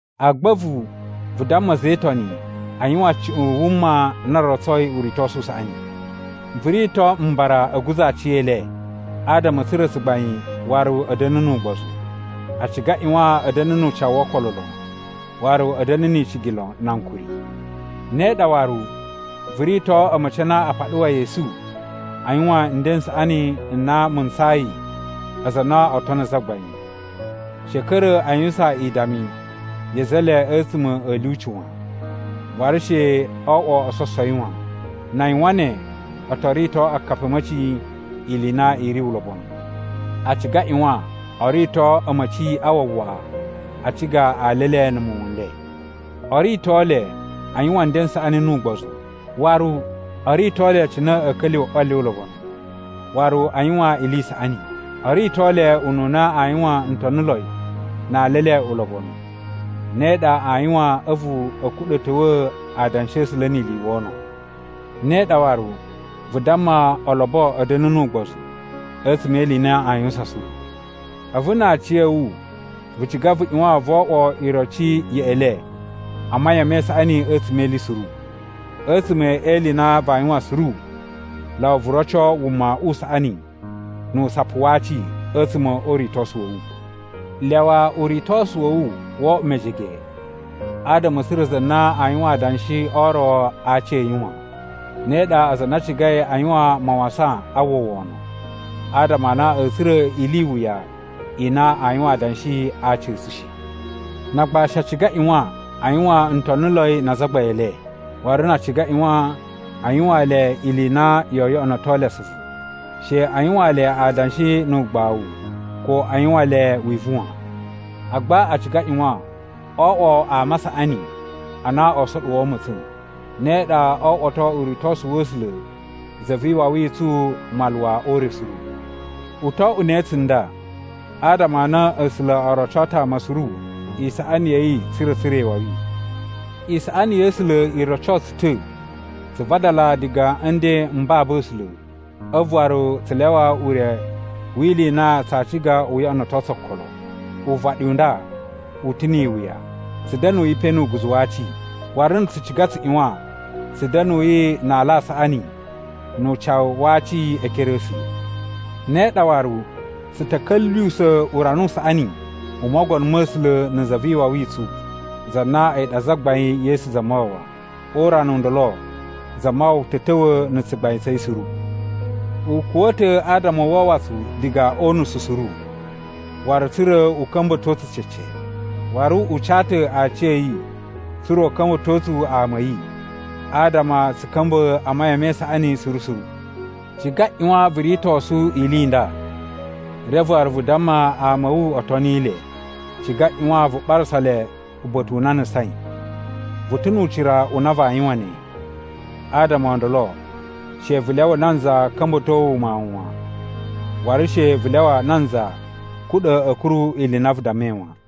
Agba a̱vu, vu damma a̱za̱ e Itoni a yuwan cuꞌun wuma na rotsoi uritosu u saꞌani. Vu rito mbara a̱ guza̱ aciyele, adama a̱ tsura̱ tsugbain waru a̱ da̱na̱ nu ugbozu. A ciga a ꞌyuwan a̱ da̱na̱ nu ucawu wo okolo lon, waru a̱ da̱na̱ ni icigi lon na ankuri. Ne ɗa waru, vu rito a̱ma̱ci a na a paɗuwai esu a yuwan nden n saꞌani n na mu ntsayi aza a na oo tono Zagbain. She a̱ ka̱ra̱ a yuwusan idami ya̱ a̱za̱ e le a̱tsuma̱ a̱ lyuci wan, waru she o oꞌwo ososowi wan. Na a yuwan ne, oo to rito akapi a̱ a̱ma̱ci ili i na i ri ulobonu. A ciga a ꞌyuwan o rito a̱ma̱ci a wawaꞌa a ciga ali e le na̱ muwun n le. O rito le a yuwan nden n saꞌani nu ugbozu. Waru o rito le cine a̱a̱ ka̱lyuwa̱ ꞌwa le ulobonu, waru a yuwan ili i saꞌani. O rito le ununa aa yuwan ntoniloi na ali e le ulobonu. Ne ɗa aa yuwan a̱vu a̱ kuɗa̱ ta̱wa̱a̱ Adanshi a̱ A̱sula̱ ni ili i wono. Ne ɗa waru, vu damma olobo a̱ da̱na̱ nu ugbozu a̱tsuma̱ e ili i na aa yuwusan suru. A̱vu na a aciya̱wu vu ciga vu ꞌyuwan vo oꞌwo iroci yeꞌe le a mayan me isaꞌani a̱tsuma̱ e ili suru. A̱tsuma̱ e ili i na vaa yuwan suru, lyawa vu roco wuma u saꞌani nu usapu wa aci a̱tsuma̱ o uritosu wa̱ wu. Lyawa uritosu wa̱ wu wo oꞌwo mejege adama a̱ tsura̱ za na aa yuwan adanshi o ro a aci a̱ yi wan. Ne ɗa aza a na a cigai a yuwan mawasan a uwwa wono, adama a na a̱a̱ tsura̱ ili i wuya i na aa yuwan adanshi a aci a̱ tsu shi. Na agbashi a ciga a ꞌyuwan a yuwan ntoniloi na azagbain e le, waru na a ciga a ꞌyuwan a yuwaan le ili i na yoo yoꞌonoto le asuvu. She a yuwaan le adanshi nu ugbawu ko a yuwan le wivu wan. Agba a ciga a ꞌyuwan o oꞌwo ama a saꞌani a na oo soɗuwo ma̱tsa̱n. Ne ɗa oo oꞌwoto uritosu wa̱ A̱sula̱ Za vi Iwawi i tsu maluwa o ure suru. U to oꞌwo ne tsunda, adama a na A̱sula̱ o roco ta̱ ama suru isaꞌani ya̱ yi tsa̱ra̱ a̱ tsura̱ iwawi. Isaꞌani ya̱ A̱sula̱ i roco tsu ta̱ tsu vadala diga a̱ nden m babu A̱sula̱ a̱vu waru tsu lyawa ure wi ili i na tsaa ciga u yoꞌonoto tsu okolo. Uvaɗi u nda u ta̱ ni iwuya, tsu da̱nuyi pe nu uguzu wa aci. Waru na̱ tsu ciga tsu ꞌyuwan tsu da̱nuyi na ala a saꞌani nu ucawu wa aci e ekere a̱ A̱sula̱. Ne ɗa waru, tsu ta̱ ka̱lyuwusa̱ urana u saꞌani u Mogono ma̱ A̱sula̱ na̱ Za vi Iwawi i tsu, za na a̱yi ɗa Zagbain Yesu Zamawawa. O urana u ndolo Zamawawa ta̱ ta̱wa̱ na̱ tsugbain tsa̱ yi suru. U kuwa̱ ta̱ adama u wawa tsu diga o unusu suru, waru tsa̱ra̱ u ka̱mba̱to tsu cece. Waru u ca ta̱ aciya̱yi tsa̱ra̱ u ka̱mba̱to tsu ama a̱ yi, adama tsu ka̱mba̱ a mayan me isaꞌani suru suru. Ciga ꞌyuwan vu ritosu ili i nda, reve waru vu damma ama a̱ wu o toni le. Ciga ꞌyuwan vu ɓarasa le uba̱ta̱ u na a nusain. Vu ta̱ nu ucira u na vaa yuwan ne, adama o ndolo she vu lyawa nanza ka̱mba̱to wu mawun wan, waru she vu lyawa nanza kuɗa̱ a̱ kuru ili i na vu dammai wan.